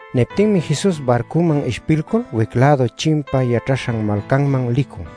Niptinmi Jesus barcuman ishpilcul wic-lädu chimpa yaćhaśhan malcanman licun.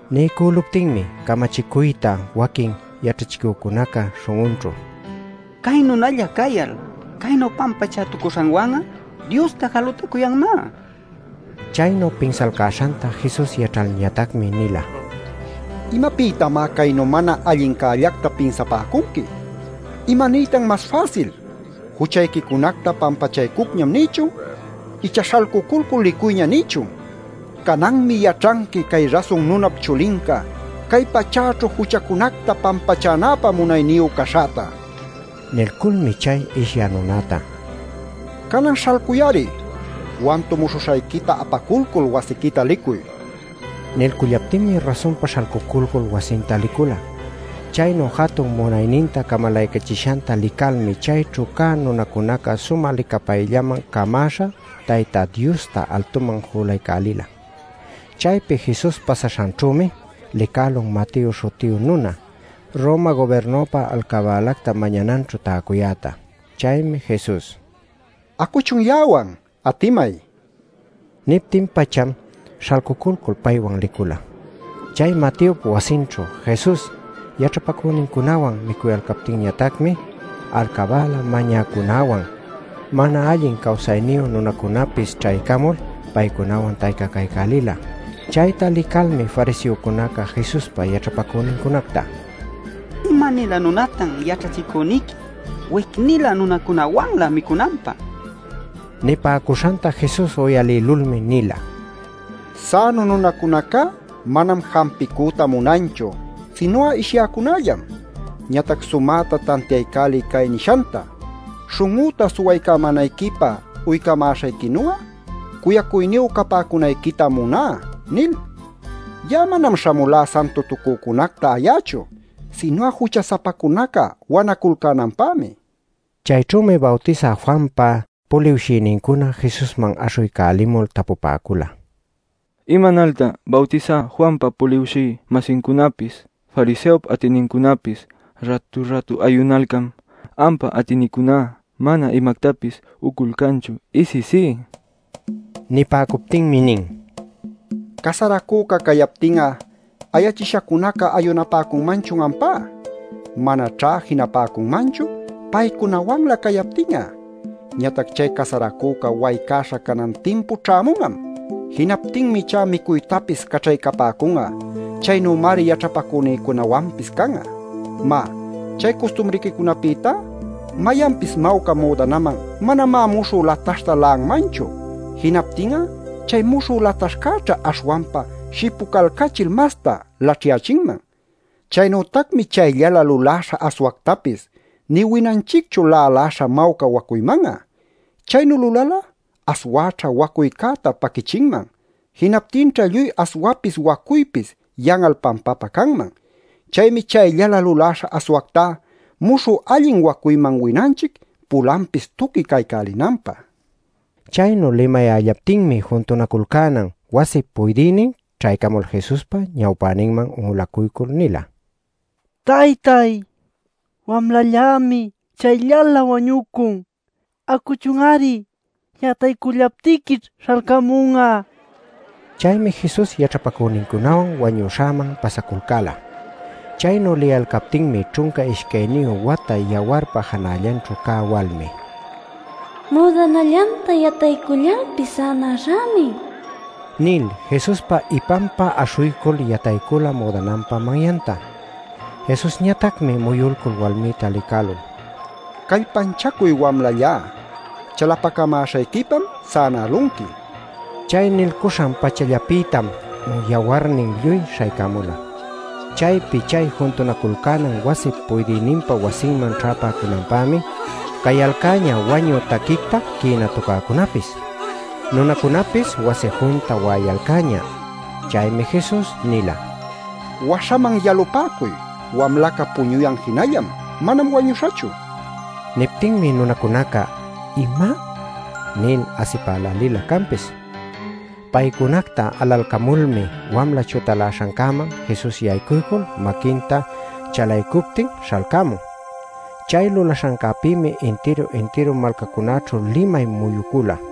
Niycüluptinmi camachicuyta waquin yaćhachicücunaca śhun'unćhu: “¡Cay nunalla cayal caynu pampachätucuśhanwan'a Diosta jalutacuyanmá!” nipäcun. Chaynu pinsalcäśhanta Jesus yaćhalñatacmi nila: “¿Imapïtamá caynu mana allincällacta pinsapäcunqui? ¿Imaniytan mas fäsil: ‘Juchayquicunacta pampachaycucñam’ nïchun icha ‘Śhalcuculcul licuyña’ nïchun? Cananmi yaćhanqui cay Rasun Nunap Chulinca, cay pachäćhu juchacunacta pampachänäpä munayniyu caśhäta” nil. Nilculmi chay ishyä nunäta: “Canan ¡śhalcuy-ari! ¡Wantumuśhuśhayquita apaculcul wasiquita licuy!” nin. Nilcullaptinmi rasunpa śhalcuculcul wasinta licula. Chaynu jatun munayninta camalaycachishanta licalmi chayćhu cä nunacunaca sumä licapayllaman camäśha Tayta Diosta altuman julaycälila. Chaypi Jesus pasaśhanćhümi licälun Mateo śhutiyu nuna Roma gubirnupä alcabälacta mañananćhu täcuyäta. Chaymi Jesus: “Acuchun ya'awan, atimay” nin. Niptin-pacham śhalcuculcul paywan licula. Chay Mateop wasinćhu Jesus yaćhapacünincunawan micuyalcaptinñatacmi alcabäla mañäcücunäwan, mana allin cawsayniyu nunacunäpis ćhaycamul paycunawan taycacaycälila. Chayta licalmi fariseocunaca Jesuspa yaćhapacünincunacta: “¡¿Ima-nilä nunatan yaćhachicüniqui wic-nilä nunacunawanlä micunanpä?!” nin. Nipäcuśhanta Jesus uyalïlulmi nila: “Sänu nunacunacá manam jampicüta munanchu, sinu'a ishyäcunallam. Ñatac sumäta tantiaycäliy cay nishanta: ‘Śhun'üta suwaycamänayquipä uycamäśhayquinu'a, cuyacuyniyu capäcunayquitam muná’ nil. Ya'a manam śhamulá santutucücunacta ayächu, sinu'a jucha-sapacunaca wanaculcänanpämi” nin. Chayćhümi Bawtisä Juanpa puliwshïnincuna Jesusman aśhuycälimul tapupäcula: “¿Imanaltan Bawtisä Juanpa puliwshï-masincunapis, fariseop atïnincunapis rätu-rätu ayunalcan, ampa atïniquicuná mana imactapis uculcanchu isisí?” nil. Nipäcuptinmi nin: “¿Casaracüca cayaptin'a ayachishacunaca ayunapäcunmanchun ampá? Manaćhá jinapäcunmanchu paycunawanlä cayaptin'a. Ñatac chay casaracüca waycaśha canan timpu ćhämun'am. Jinaptinmi ichá micuytapis caćhaycapäcun'a. Chaynümari yaćhapacünïcunawanpis can'a. “Má, chay custumriquicunapïtá, mayanpis mawca müdanaman manamá muśhü lataśhta la'anmanchu. Jinaptin'a chay muśhü lataśhcäćha aśhwanpa shipulcachil masta laćhyächinman. Chaynütacmi chayllalä luläśha aswactapis nï winanchicchu lälaśha mawca wacuyman'a. Chaynu lulal'a aswäćha wacuycäta paquïchinman; jinaptinćha lluy aswapis wacuypis yan'al pampapä canman. Chaymi chayllalä luläśha aswactá muśhü allin wacuyman winanchic pulanpis tuqui caycälinanpä” nil. Chaynu limayällaptinmi juntunaculcänan wasip puydïnin ćhaycamul Jesuspa ñawpäninman un'ulacuycul nila: “¡Taytay, wamlallämi chayllalä wañucun! ¡Acuchun-ari, yataycullaptiquićh śhalcämun'a!” nil. Chaymi Jesus yaćhapacünincunawan wañüśhäman pasaculcäla. Chaynu liyalcaptinmi ćhunca ishcayniyu wata yawarpa janallanćhu cä walmi, “Müdanallanta yataycullalpis sänäśhämi” nil Jesuspa ipanpa aśhuycul yataycula müdananpa manyanta. Jesusñatacmi muyulcul walmïta licälul: “Callpanchacuy wamlallá; chalapacamäśhayquipam sänälunqui” nin. Chay nilcuśhan-pachallapïtam yawarnin lluy śhaycämula. Chaypi chay juntunaculcänan wasip puydïninpa wasinman ćhäpäcunanpämi cayalcäñä wañü taquicta quïna tucäcunäpis. Nunacunapis wasi junta wa'ayalcäñä. Chaymi Jesus nila: “Waśhaman yalupäcuy. Wamlaca puñuyan jinallam; manam wañüśhachu” nil. Niptinmi nunacunaca “¿Ima?” nil asipälälinlä canpis. Paycunacta alalcamulmi wamla chutaläśhancäman Jesus yaycuycul maquinta chalaycuptin, śhalcämun. Chay lulaśhancäpïmi intiru-intiru malcacunaćhu limay muyucula.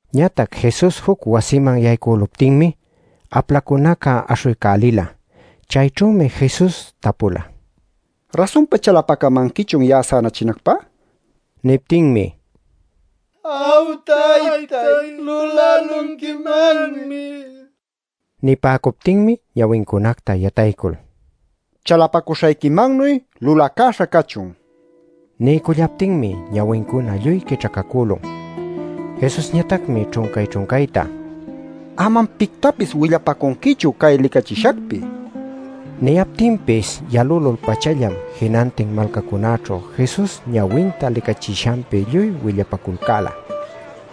Ñatac Jesus juc wasiman yaycüluptinmi aplacunaca aśhuycälila. Chayćhümi Jesus tapula: “¿Rasunpa chalapacamanquichun ya'a sänachinacpä?” nil. Niptinmi: “Aw, taytay lulälunquimanmi” nila. Nipäcuptinmi ñawincunacta yataycul: “Chalapacuśhayquimannuy lulacäśha cachun” nila. Niycullaptinmi ñawincuna lluy quićhacacülun. Jesusñatacmi ćhuncay-ćhuncayta: “Amam pictapis willapacunquichu cay licachishacpi” nila. Niyaptinpis yalülul-pachallam jinantin malcacunäćhu Jesus ñawinta licachishanpi lluy willapaculcäla.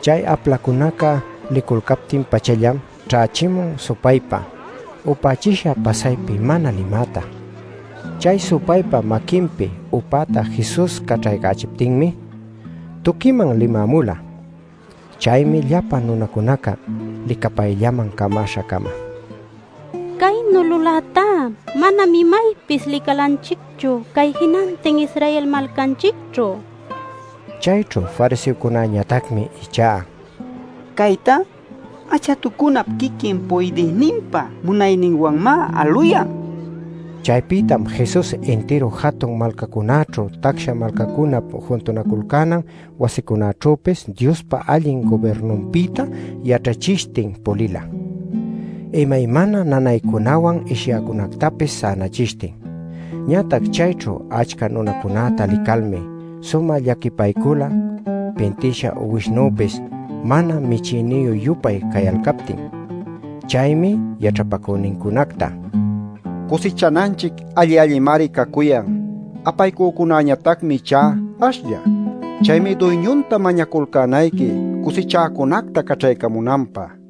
Chay aplacunaca liculcaptin-pachallam ćhächimun supaypa upächisha pasaypi mana limäta. Chay supaypa maquinpi upäta Jesus caćhaycächiptinmi, tuquiman limämula. Chaymi llapa nunacunaca licapayllaman camaśha-cama: “¡Caynu lulätá, manam imaypis licalanchicchu cay jinantin Israel malcanchicćhu!” ninacücuyalcan. Chayćhu fariseocunäñatacmi ichá: “¡Caytá achatucunap quiquin puydïninpa munayninwanmá aluyan!” nipäcula. Chaypïtam Jesus intiru jatun malcacunäćhu tacsa malcacunap juntunaculcänan wasicunaćhüpis Diospa allin gubirnunpïta yaćhachishtin pulila, imaymana nanaycunawan ishyäcunätapis sänaycachishtin. Ñatac chayćhu achca nunacunäta licalmi sumä llaquipaycula pintïsha uwishnüpis mana michïniyü-yupay cayalcaptin. Chaymi yaćhapacünincunacta: “Cusichananchic alli-allimari cacuyan; apaycücunäñatacmi ichá ashlla. Chaymi Duyñunta mañaculcänayqui cusichäcunacta caćhaycamunanpä” nila.